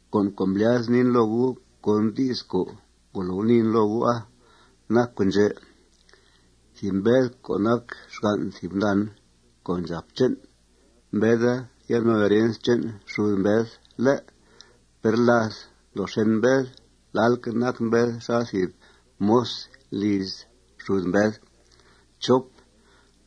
Con' co' mblyazen niin loo gu' con di's co' ngolo guniin loo gu'a nac con' ndxè': Thìb mbed co' nac xgan' thìb gundan co' ndxàp che'n, mbeda yan' no herens che'n xud mbed, ¿lé'? Per láth ndoo xèn mbed, lalque' nac mbed xal thìb moz liz xud mbed.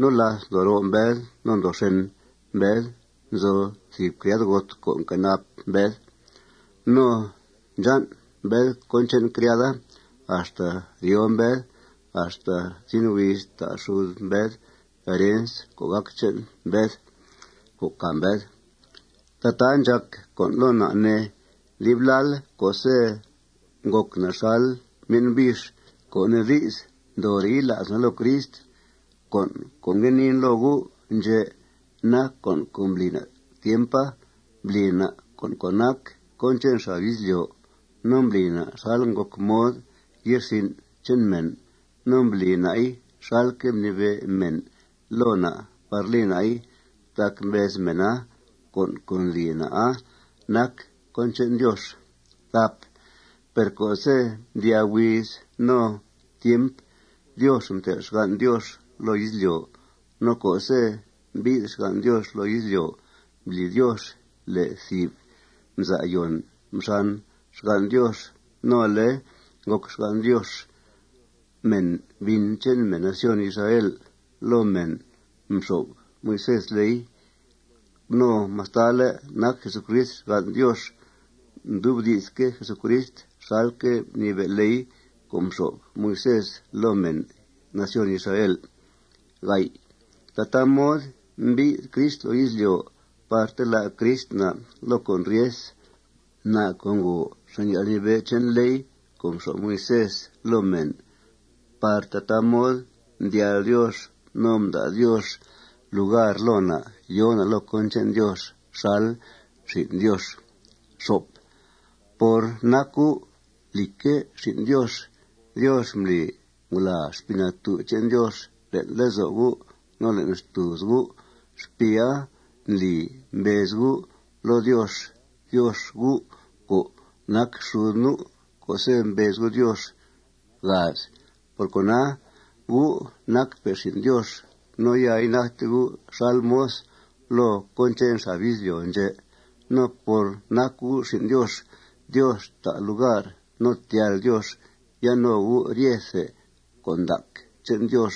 No láth ndoo roo mbed no ndoo xèn mbed, nzo thìb criadgot co' nquenap mbed. No ndxan' mbed cón che'n criada axta ryoo mbed axta zin huiz ta' xud mbed herens co' gac che'n mbed càa mbed. Tataa ndxàc con' loo na', ne, dib lal co'se' ngòc na' xal myen' bix, co' nee di's, ndoore' yila's na' loo Crist. Con' co' ngue niin loo gu' ndxè' nac con' co' mbli na' tiempa: Mbli na' co' nac cón che'n xab izlyo'. No mbli na' xal ngòc mod ye'rsin' che'n mèn. No mbli na'i xalque' mnibe' mèn loo na' par li na'i, tac mbez mèna con' co' ndli na'a nac cón che'n Diox. Per co'se' mdyaa huiz no tiempa, Diox mtel' xgan' Diox loo izlyo'. No co'se' mbi'th xgan' Diox loo izlyo', mbli Diox le' thìb mza'yòn mxan xgan' Diox. No ale ngòc xgan' Diox mèn bin che'n mèn nación Israel. Loo mèna mxo'f Moisés ley. No mastale' nac Jesucrist xgan' Diox, mdubdi'sque' Jesucrist xalque' mnibe' ley co' mxo'f Moisés loo mèn nación Israel. Tataa mod mbi'th Crist loo izlyo' par telá' Crist na' loo con' ryes, na' co' ngòo xàn' yalnibe' che'n ley co' mxo'f Moisés loo mèn par tataa mod mdyal Diox no mda' Diox lugar loo na' yòo na' loo cón che'n Diox xal xin' Diox. Por nac gu', lìcque', xin' Diox, Diox mbli ngulàa Xpii Natú' che'n Diox le'n lezo' gu' no le'n xtùuz gu'. Xpiia ndli mbez gu' loo Diox: Diox, U' co' nac xud nu', co'se' mbez gu' Diox. Por cona, gu' nacpe' xin' Diox. No ya inacte gu' xal moz loo cón che'n xab izlyo' ndxè'. No por nac gu' xin' Diox, Diox ta' lugar no tyal Diox yan' no gu' ryethe con' ndac che'n Diox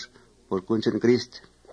por cón che'n Crist.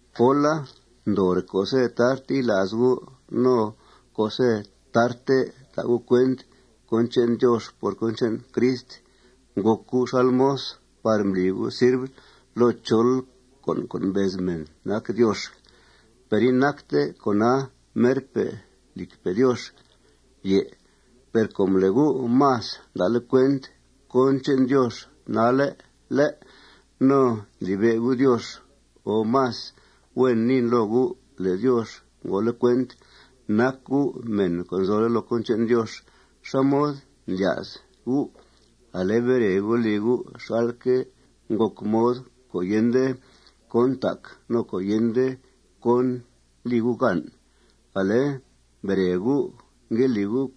Póla, ndoore' co'se' tarte yila's gu' no co'se' tarte ta' gu' cuent cón che'n Diox por cón che'n Crist, ngòc gu' xal moz par mbli gu' sirv loo chol con' co' mbez mèn nac diox. Per inacte con'a merpe', lìcpe' Diox. Per com le' gu' más nda'le' cuent cón che'n Diox nalle', ¿lé'?, no ndlibe' gu' Diox, o más huen niin loo gu' le' Diox ngole' cuent nac gu' mèn co' nzole' loo cón che'n Diox, ¿xá mod ndlya's gu' ale bere gu', li gu' xalque' ngòc mod co' yende cón ntac no co' yende cón li gu' gan? Ale, mbere gu', ngue li gu'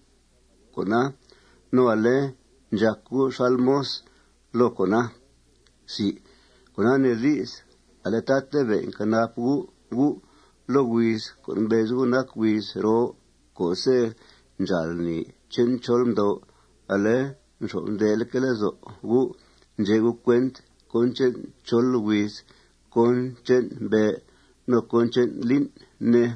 con'a. No ale ndxàc gu' xal moz loo con'a. Cona nee di's ale tatabe' nquenap gu' gu' loo huiz co' mbez gu' nac huiz roo co'se' ndxáal lni che'n chol mdo'. Ale nxyo'f ndeleque' lezo' gu' ndxe' gu' cuent cón che'n chol huiz, cón che'n mbe', no cón che'n lín', ne.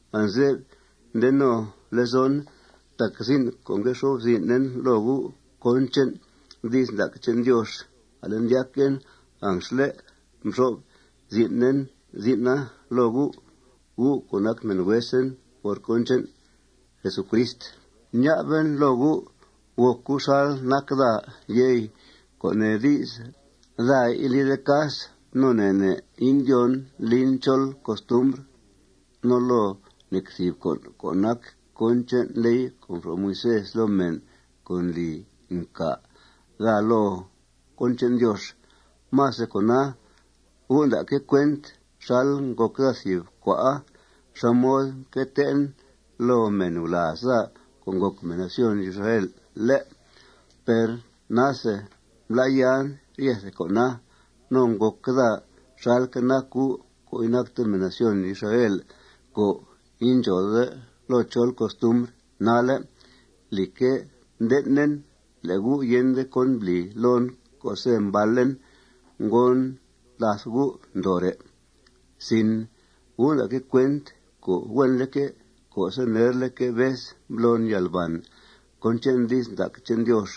Anze'f nde no lezon tac zin' co' ngue xo'f zin'en loo gu' cón che'n di's ndac che'n Diox, ale ndyaquen anxle' mxo'f zin'en zin'a loo gu'. Gu' co' nac mèn huesen por cón che'n Jesucrist, ña'ben loo gu': Gòc gu' xal nac daa, yey, co' nee di's, daa indlide cas no ne' ne' indyóon lin chol costumbr, no loo nec thìb con' co' nac cón che'n ley co' mxo'f Moisés loo mèn co' ndli ncà daa loo cón che'n Diox. Más de cona, gu' nda'que' cuent xal ngòc daa thìb cua'a; xá mod mque tee'en loo mèn gulàaz daa co' ngòc mèn nación Israel, ¿lé'? Per nase mblá'yan ryethe con'a. No ngòc daa xalque' nac gu' co' inacte mèn nación Israel co' indxòode loo chol costumbr nalle'. Lìcque', mden'en le' gu' yende cón mbli loon co'se' mbalen. Ngon làth gu' ndoore'. Gu' nda'que' cuent co' huenleque', co'se' nerleque' vez mblon yalbàn cón che'n di's ndac che'n Diox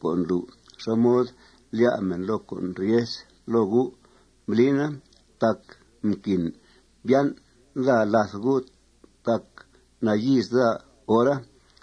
co' ndlu' xá mod lyá' mèn loo con' ryes loo gu', mblina tac mquin mbyan' daa làth gu' tac nayíiz daa hora.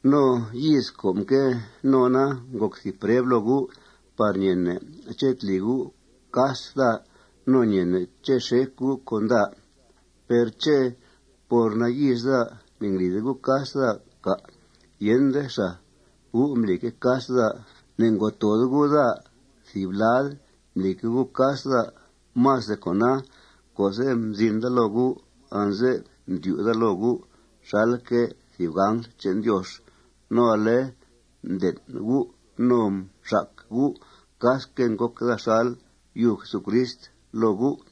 No yíiz co' mque nona ngòc thìb preb loo gu' par ñeene' ché' tli gu' cas daa no ñeene' ché' xec gu' con daa. Per ¿ché' por nayíiz daa, ne'nglide gu' cas daa, cà'? Yende xàa. Gu' mblique' cas daa. Ne'ngo' toode gu' daa thìb lad. Mblique' gu' cas daa. Más de cona, co'se' mzin daa loo gu', anze'f mdyu' daa loo gu' xalque' thìb angl che'n Diox. No ale mden' gu' no mxac gu' casque' ngòc daa xal yub Jesucrist loo gu'.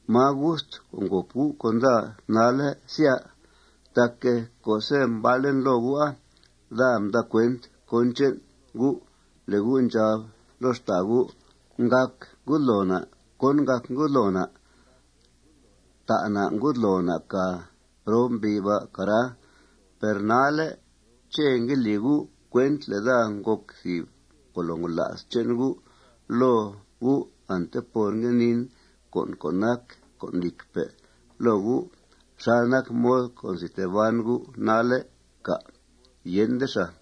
¿Máa gust co' ngòp gu' con daa nalle', sya? Tac co'se' mbalen loo gu'a, daa mda' cuent cón che'n gu' le' gu' ndxab loo xtàa gu': Ngàc ngudloo na' ¿cón ngàc ngudloo na'? Ta' na' ngudloo na' càa prob mbi' ba', cara. Per nalle', ¿ché' ngue li gu' cuent le' daa ngòc thìb ngolo ngola's che'n gu' loo gu' ante por ngue niin con' co' nac con' lìcpe' loo gu' xal nac mod co' nzi tee ban gu' nalle', cà'? Yende xàa.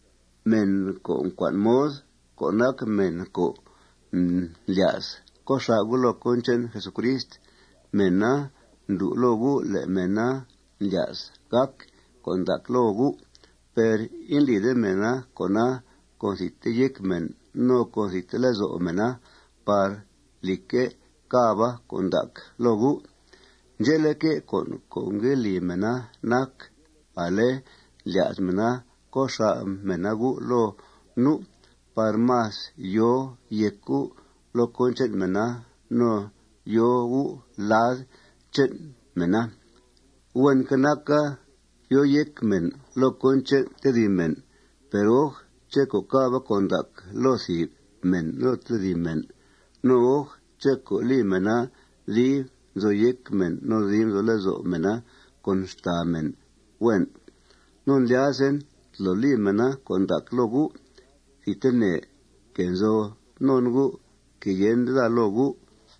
Mèn co' ngue cua'n mod, co' nac mèn co' ndlya's co' xà' gu' loo cón che'n Jesucrist, mèna ndlu' loo gu' le' mèna ndlya's gàc con' ndac loo gu'. Per indlide mèna con'a con thidte yéc mèna no con thidte lezo' mèna par, lìcque', càba con' ndac loo gu'. Ndxe'leque', con' co' ngue li mèna nac: Ale ndlya's mèna co' xà' mèna gu' loo nu' par más yòo yéc gu' loo cón che'n mèna no yòo gu' lad che'n mèna. Huenque' naca yòo yéc mèn loo cón che'n tedib mèn. Per, oj, ché' co' càba con' ndac loo thìb mèn no loo tedib mèn. No, oj, ché' co' li mèna dib nzo yéc mèn no dib nzo lezo' mèna con xtàa mèn, huen. No ndlyazen tolo li mèna con' ndac loo gu' thidtene, que nzo non gu', que yende daa loo gu'.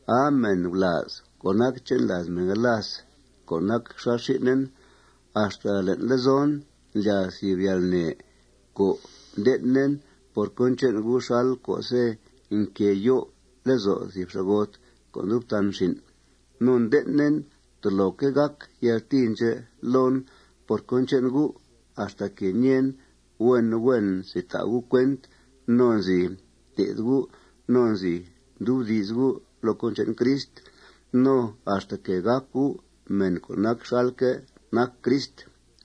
¡Aa, mèn gulàaz co' nac che'n làaz mèn galas co' nac xal xin'en! Axta le'n lezon ndlyàa thìb yalnè co' nden'en por cón che'n gu' xal co'se' nquée yo'f lezo' thìb xa'got co' ndub tan xin'. No nden'en toloque' gàc yaltìi ndxè' loon por cón che'n gu' axtaque' ñeen huen huen nzi ta' gu' cuent no nzi té'th gu' no nzi ndubdi's gu' loo cón che'n Crist no axtaque' gàc gu' mèn co' nac xalque' nac Crist.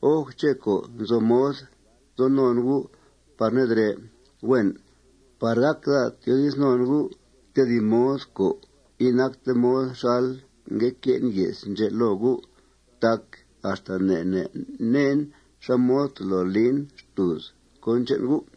Oj, ché' co' nzo mod nzo non gu' par nedrè', huen, par gác daa tyoodiz non gu' tedib mod co' inacte mod xal ngue que'en ye's ndxè' loo gu'. Tac axta ne' ne' neen xá mod tolo lin xtùuz cón che'n gu'.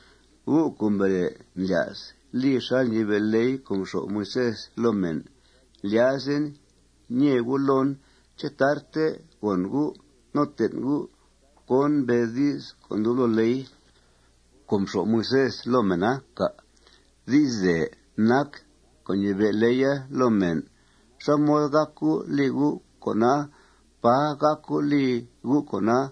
Gu' co' mbere ndlya's li xal ñibe' ley co' mxo'f Moisés loo mèn, ndlyazen ñee gu' loon: ¿Ché' tarte gòn gu' no ten' gu' cón mbez di's co' ndub loo ley co' mxo'f Moisés loo mèna, cà'? Di'sdèe nac co' ñibe' leya loo mèn. ¿Xá mod gác gu' li gu' con'a? ¡Pà gác gu' li gu' con'a!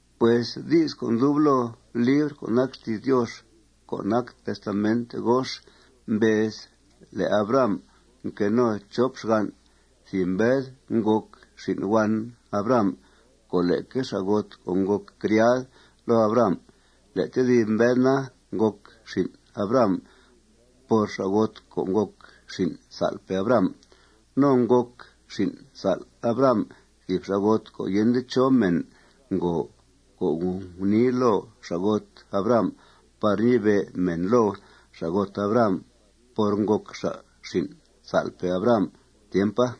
Pues di's co' ndub loo libr co' nac xti's Diox co' nac Testament Gox mbez le' Abraham mque no chop xgan'. Thìb mbed ngòc xin' huan Abraham con leque xa'got co' ngòc criad loo Abraham. Le' tedib mbed na, ngòc xin' Abraham por xa'got co' ngòc xin' sa'lpe' Abraham. No ngòc xin' sa'l Abraham thìb xa'got co' yende chó mèn ngo co' ngnii loo xa'got Abraham par ñibe' mèn loo xa'got Abraham por ngòc xa' xin' sa'lpe' Abraham tiempa.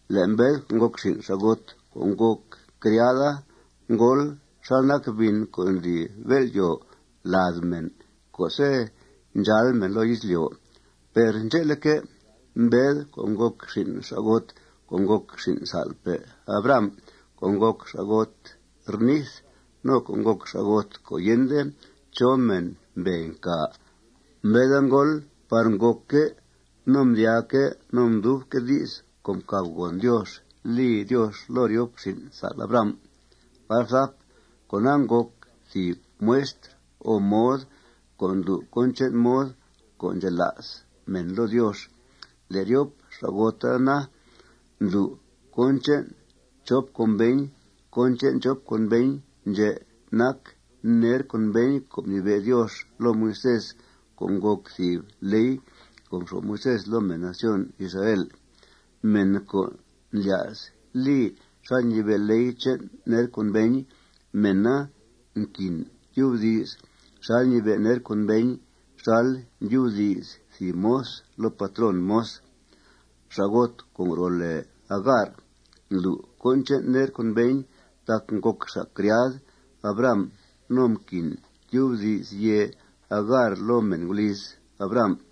Le' mbed co' ngòc xin' xa'got co' ngòc criada ngóol xal nac bin co' ndli bél'yòo lad mèn co'se' ndxáal mèn loo izlyo'. Per ndxe'leque', mbed co' ngòc xin' xa'got co' ngòc xin' sa'lpe' Abraham co' ngòc xa'got rnith no co' ngòc xa'got co' yende chó mèn mbee ncà, mbeda ngóol par ngòcque' no mdyaaque' no mdubque' di's co' mcàbgòn Diox li Diox loo ryop xin' sa'l Abraham. Con'a ngòc thìb muestr o mod co' ndlu' cón che'n mod co' ndxela's mèn loo Diox. Le' ryop xa'gota na, ndlu' cón che'n chop conveñ. Cón che'n chop conveñ ndxè' nac: Ner conveñ co' mnibe' Diox loo Moisés co' ngòc thìb ley co' mxo'f Moisés loo mèn nación Israel. Mèn co' ndlya's li xal ñibe' ley che'n ner conveñ, mèna nquin tyubdi's xal ñibe' ner conveña xal ndyubdi's thìb moz loo patrón moz. Xa'got co' ngro' lèe Agar ndlu' cón che'n ner conveñ tac ngòc xa' criad Abraham no mquin tyubdi's yèe Agar loo mèn guliz Abraham.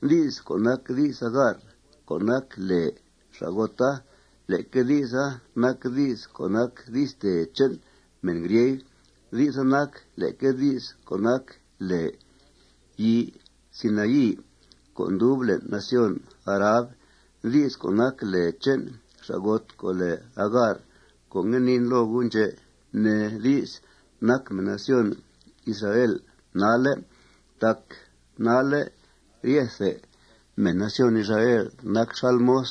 Di's co' nac di's Agar co' nac lèe xa'gota, leque di'sa nac di's co' nac di'stèe che'n mèn grieg. Di'sa nac leque di's co' nac lèe yii Sinaí co' ndub le'n nación Arab. Di's co' nac lèe che'n xa'got co' lèe Agar co' ngue niin loo gu' ndxè' nee di's nac mèn nación Israel nalle'. Tac nalle' ryethe mèn nación Israel nac xal moz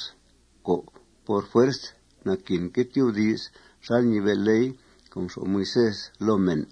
co', por fuerz, naquinque' tyubdi's xal ñibe' ley co' mxo'f Moisés loo mèn.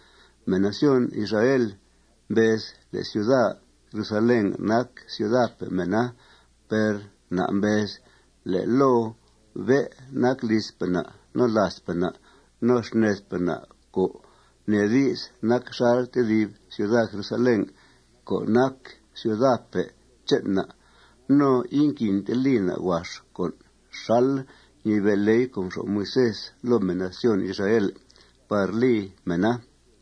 Mèn nación Israel mbez le' ciuda Jerusalén nac ciudape' mèna. Per na' mbez le' loo bé' nac lizpe' na' no làazpe' na' no xnedpe' na', co' nee di's, nac xal tedib ciuda Jerusalén co' nac ciudape' che'n na'. No inquinte li na' huax con' xal ñibe' ley co' mxo'f Moisés loo mèn nación Israel par li mèna.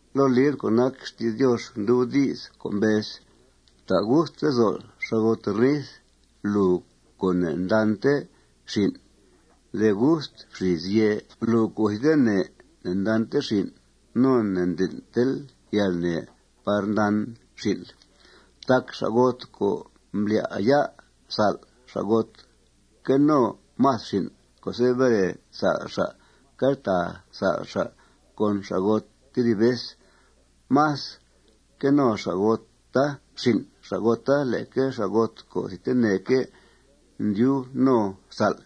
Loo libr co' nac xti's Diox ndub di's co' mbez: Fta' gust lezo'l, xa'got rnith, lùu co' ne'ndante xin'. De gust fxìis yèe, lùu co' thidtene ne'ndante xin'. No ne'nden'tel yalnè par ndan xin'l. Tac xa'got co' mblá'ya' sa'l, xa'gota que no más xin' co'se' bere sa'l xa', queltàa sa'l xa' con xa'gota tedib vez. Más que no xa'gota xin' xa'gota leque xa'got co' thidteneque' ndyub no sa'l.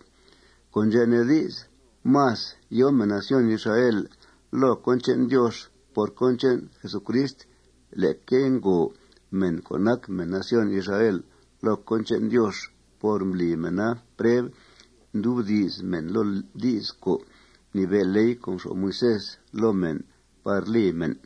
Con' ndxè' nee di's más yòo mèn nación Israel loo cón che'n Diox por cón che'n Jesucrist leque ngòo mèn co' nac mèn nación Israel loo cón che'n Diox por mbli mèna preb ndubdi's mèn loo di's co' mnibe' ley co' mxo'f Moisés loo mèn par li mèn.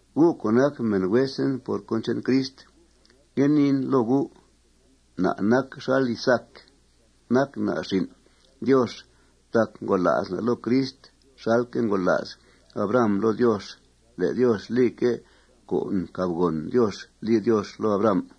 Gu' co' nac mèn huesen por cón che'n Crist, ngue niin loo gu': Na' nac xal Isaac. Nac na' xin' Diox tac ngola's na' loo Crist xalque' ngola's Abraham loo Diox le' Diox lique' con' mcàbgòn Diox li Diox loo Abraham.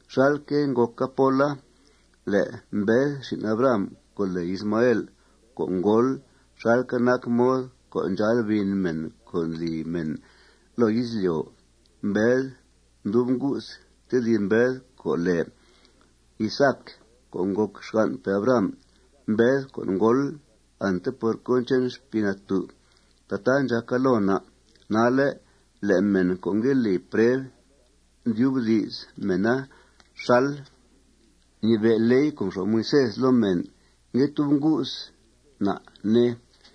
Xalque' ngòca póla, le' mbed xin' Abraham co' lèe Ismael, co' ngóol xalque' nac mod co' ndxáal bin mèn co' ndli mèn loo izlyo', mbed mdub ngu's tedib mbed co' lèe Isaac co' ngòc xganpe' Abraham, mbed co' ngóol ante por cón che'n Xpii Natú'. Tataa ndxàca loo na' nalle' le' mèn co' ngue li preb ndubdi's mèna xal ñibe' ley co' mxo'f Moisés loo mèn ngue tub ngu's na', ne.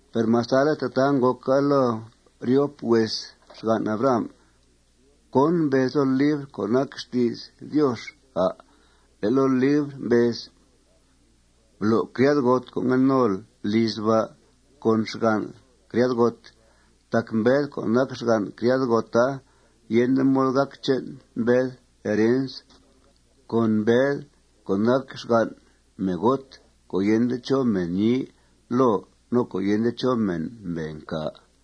Per mastale' tataa ngòca loo ryop hues xgan' Abraham, ¿cón mbez loo libr co' nac xti's Diox, à'? Le' loo libra mbez: Blo' criadgot co' ngue nol lizl ba' con xgan' criadgot. Tac mbed co' nac xgan' criadgota, yende mod gàc che'n mbed herens con mbed co' nac xgan' meegot co' yende chó mèn ñii loo no co' yende chó mèn mbee ncà.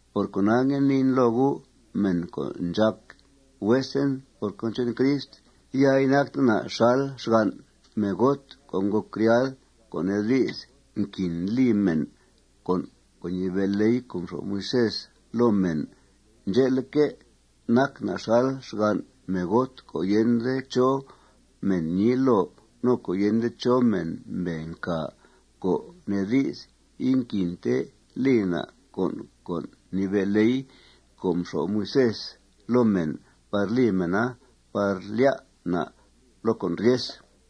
Por cona, ngue niin loo gu', mèn co' ndxàc huesen por cón che'n Crist: Ya inacte na' xal xgan' meegot co' ngòc criadgot, co' nee di's, nquin li mèn con' co' ñibe' ley co' mxo'f Moisés loo mèn. Ndxe'leque', nac na' xal xgan' meegot co' yende chó mèn ñii loo, no co' yende chó mèn mbee mcà, co' nee di's, inquinte li na' con' co' mnibe' ley co' mxo'f Moisés loo mèn par li mèna par lyá' na' loo con' ryes.